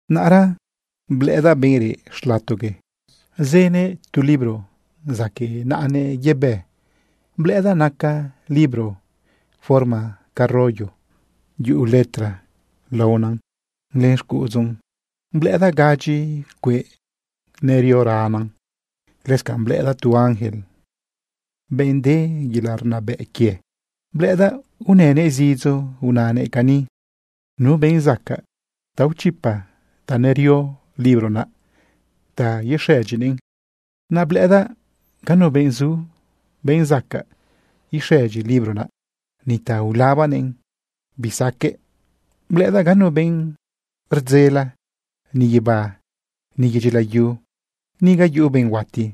Naꞌra blëꞌëdaꞌ benꞌ reꞌ xlatogue zënëꞌ tu libro zaquëꞌ naꞌanëꞌ yebë. Blëꞌëdaꞌ naca libro forma ca rollo. Yuꞌu letra laonan len xcuꞌudzun. Blëꞌëdaꞌ gadyi cueꞌ nerioranan. Lëscanꞌ blëꞌëdaꞌ tu ángel, benꞌ de yelaꞌ rnabëꞌ quie. Blëꞌëdaꞌ unënëꞌ zidzo unanëꞌ cani: ―¿Nu benꞌ zacaꞌ ta ichipa ta nerio libro naꞌ ta ixëdyinëꞌn? Naꞌ blëꞌëdaꞌ ganu benꞌ zu, benꞌ zacaꞌ ixëdyi libro naꞌ, ni ta ulabanëꞌn bisaqueꞌ. Blëꞌëdaꞌ ganu benꞌ rdzele, ni guibá, ni yedyi layu, ni ga yuꞌu benꞌ huati.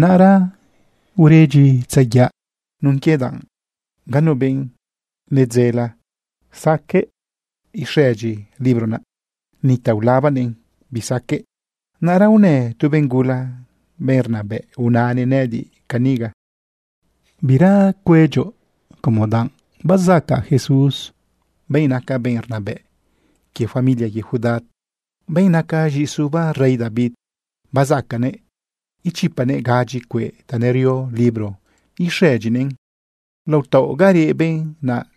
Naꞌra uredyitzayaꞌa nun quie danꞌ ganu benꞌ nedzele zacaꞌ ixëdyi libro naꞌ, ni ta ulabanëꞌn bisaqueꞌ. Naꞌra unë tu benꞌ gula, benꞌ rnabëꞌ, unanëꞌ nëꞌëdiꞌ caniga: ―Bira cuedyoꞌ como danꞌ bazacaꞌ Jesús, benꞌ naca benꞌ rnabëꞌ quie familia quie Judá, benꞌ naca z̃iꞌisuba rey David, bazacaꞌnëꞌ ichipanëꞌ gadyi cueꞌ ta nerio libro ixëdyinëꞌn. Lao taoꞌ ga reꞌ benꞌ naꞌ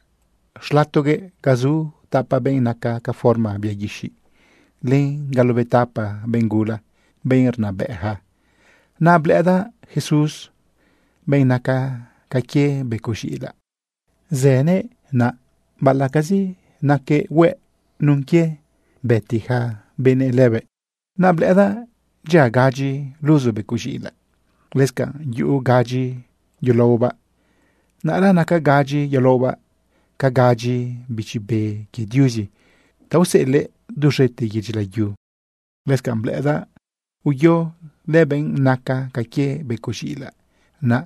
xlatogue, ga zu tapa benꞌ naca ca forma bia guixiꞌ, len galobetapa benꞌ gula, benꞌ rnabëꞌja, naꞌ blëꞌëdaꞌ Jesús, benꞌ naca ca quie becoꞌ z̃iꞌilaꞌ. Zënëꞌ naꞌ baꞌalaꞌcazi naquëꞌ hueꞌ nun quie bëti ja benëꞌ lëbëꞌ. Naꞌ blëꞌëdaꞌ dyia gadyi luzu becoꞌ z̃iꞌilaꞌ. Lëscanꞌ yuꞌu gadyi yulaobaꞌ. Naꞌra naca gadyi yulaobaꞌ ca gadyi bichi be quie Diuzi ta useꞌelëꞌ duz̃ete yedyi layu. Lëscanꞌ blëꞌëdaꞌ uyo lëbenꞌ naca ca quie becoꞌ z̃iꞌilaꞌ naꞌ,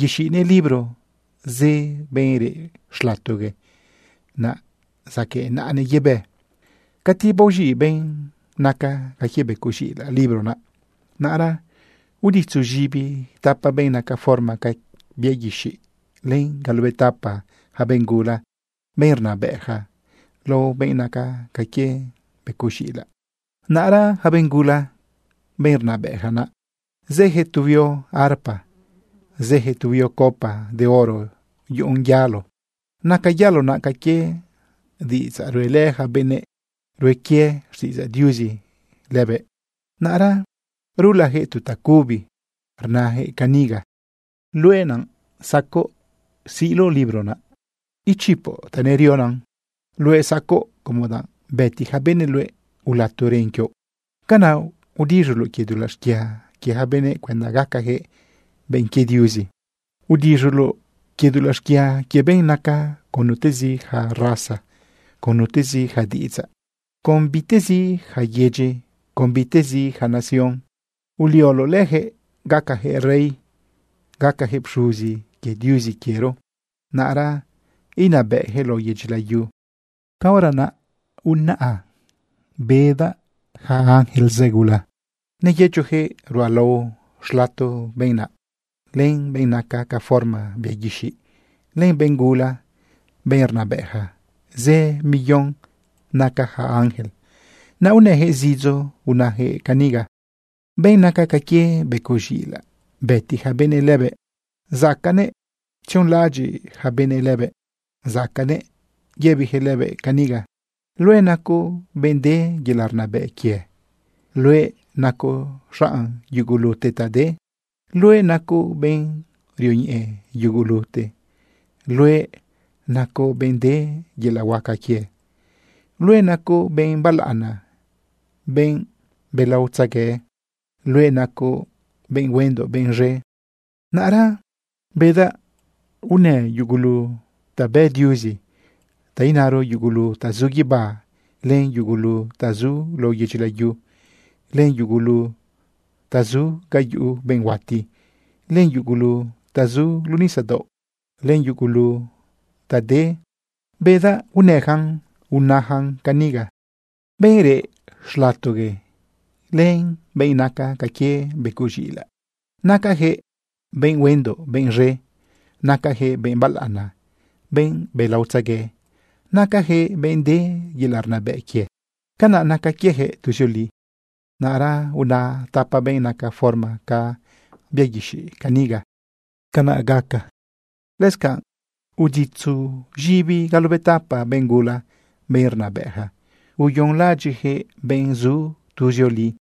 yexiꞌnëꞌ libro zë benꞌ reꞌ xlatogue naꞌ zaquëꞌ naꞌanëꞌ yebë. Cati baoz̃iꞌ benꞌ naca ca quie becoꞌ z̃iꞌilaꞌ libro naꞌ, naꞌra uditzu z̃ibi tapa benꞌ naca forma ca bia guixiꞌ, len galobetapa ja benꞌ gula, benꞌ rnabëꞌja, lao benꞌ naca ca quie becoꞌ z̃iꞌilaꞌ. Naꞌra ja benꞌ gula, benꞌ rnabëꞌja naꞌ, zëjëꞌ tu huio arpa, zëjëꞌ tu huio copa de oro yuꞌun yalo. Naca yalo naꞌ ca quie diꞌidzaꞌ ruꞌelë yaca benꞌ rue quie xtiꞌidzaꞌ Diuzi lëbëꞌ. Naꞌra rulajëꞌ tu tacubi rnajëꞌ caniga: Luëꞌ naꞌ zacoꞌ siꞌloꞌ libro naꞌ, ichipoꞌ ta nerionan. Luëꞌ zacoꞌ, como danꞌ bëti ja benëꞌ luëꞌ, ulato ren quioꞌ. Canaꞌ udiz̃uloꞌ quie dulaꞌ xquia quie ja benëꞌ cuenda gacajëꞌ benꞌ quie Diuzi. Udiz̃uloꞌ quie dulaꞌ xquia quie benꞌ naca con nutezi ja raza, con nutezi ja diꞌidzaꞌ, con bitezi ja yedyi, con bitezi ja nación. Ulioloꞌ lëjëꞌ gacajëꞌ rey, gacajëꞌ pxuzi quie Diuzi quiero. Naꞌra inabëꞌjëꞌ lao yedyi layu. Caora naꞌ unaꞌa bedaꞌ ja ángel zë gula. Neyëchojëꞌ ruꞌalao xlato benꞌ naꞌ, len benꞌ naca ca forma bia guixiꞌ, len benꞌ gula, benꞌ rnabëꞌja. Zë million naca ja ángel. Naꞌ unëjëꞌ zidzo unajëꞌ caniga: Benꞌ naca ca quie becoꞌ z̃iꞌilaꞌ, bëti ja benëꞌ lëbëꞌ, zacaꞌnëꞌ tzionlaꞌadyiꞌ ja benëꞌ lëbëꞌ. Zacaꞌnëꞌ yëbijëꞌ lëbëꞌ caniga: Luëꞌ nacoꞌ benꞌ de yelaꞌ rnabëꞌ quie. Luëꞌ nacoꞌ xaꞌn yugulute ta de. Luëꞌ nacoꞌ benꞌ rioñeꞌe yugulute. Luëꞌ nacoꞌ benꞌ de yelaꞌ huaca quie. Luëꞌ nacoꞌ benꞌ balaꞌana, benꞌ belaotzegue. Luëꞌ nacoꞌ benꞌ huendoꞌ benꞌ z̃e. Naꞌra bedaꞌ unë yugulu ta bë Diuzi, ta inaro, yugulu ta zu guibá, len yugulu ta zu lao yedyi layu, len yugulu ta zu ga yuꞌu benꞌ huati, len yugulu ta zu luꞌu nisadaoꞌ, len yugulute ta de. Bedaꞌ unëjan unajan caniga: Benꞌ reꞌ xlatogue, len benꞌ naca ca quie becoꞌ z̃iꞌilaꞌ, nacajëꞌ benꞌ huendoꞌ benꞌ z̃e. Nacajëꞌ benꞌ balaꞌana, benꞌ belaotzegue. Nacajëꞌ benꞌ de yelaꞌ rnabëꞌ quie. Canaꞌ naca quiejëꞌ tuzioli. Naꞌra una tapa benꞌ naca forma ca bia guixiꞌ caniga: ―Canꞌ gaca. Lëscanꞌ uditzu z̃ibi galobetapa benꞌ gula, benꞌ rnabëꞌja, uyonlaꞌadyiꞌjëꞌ benꞌ zu tuzioli.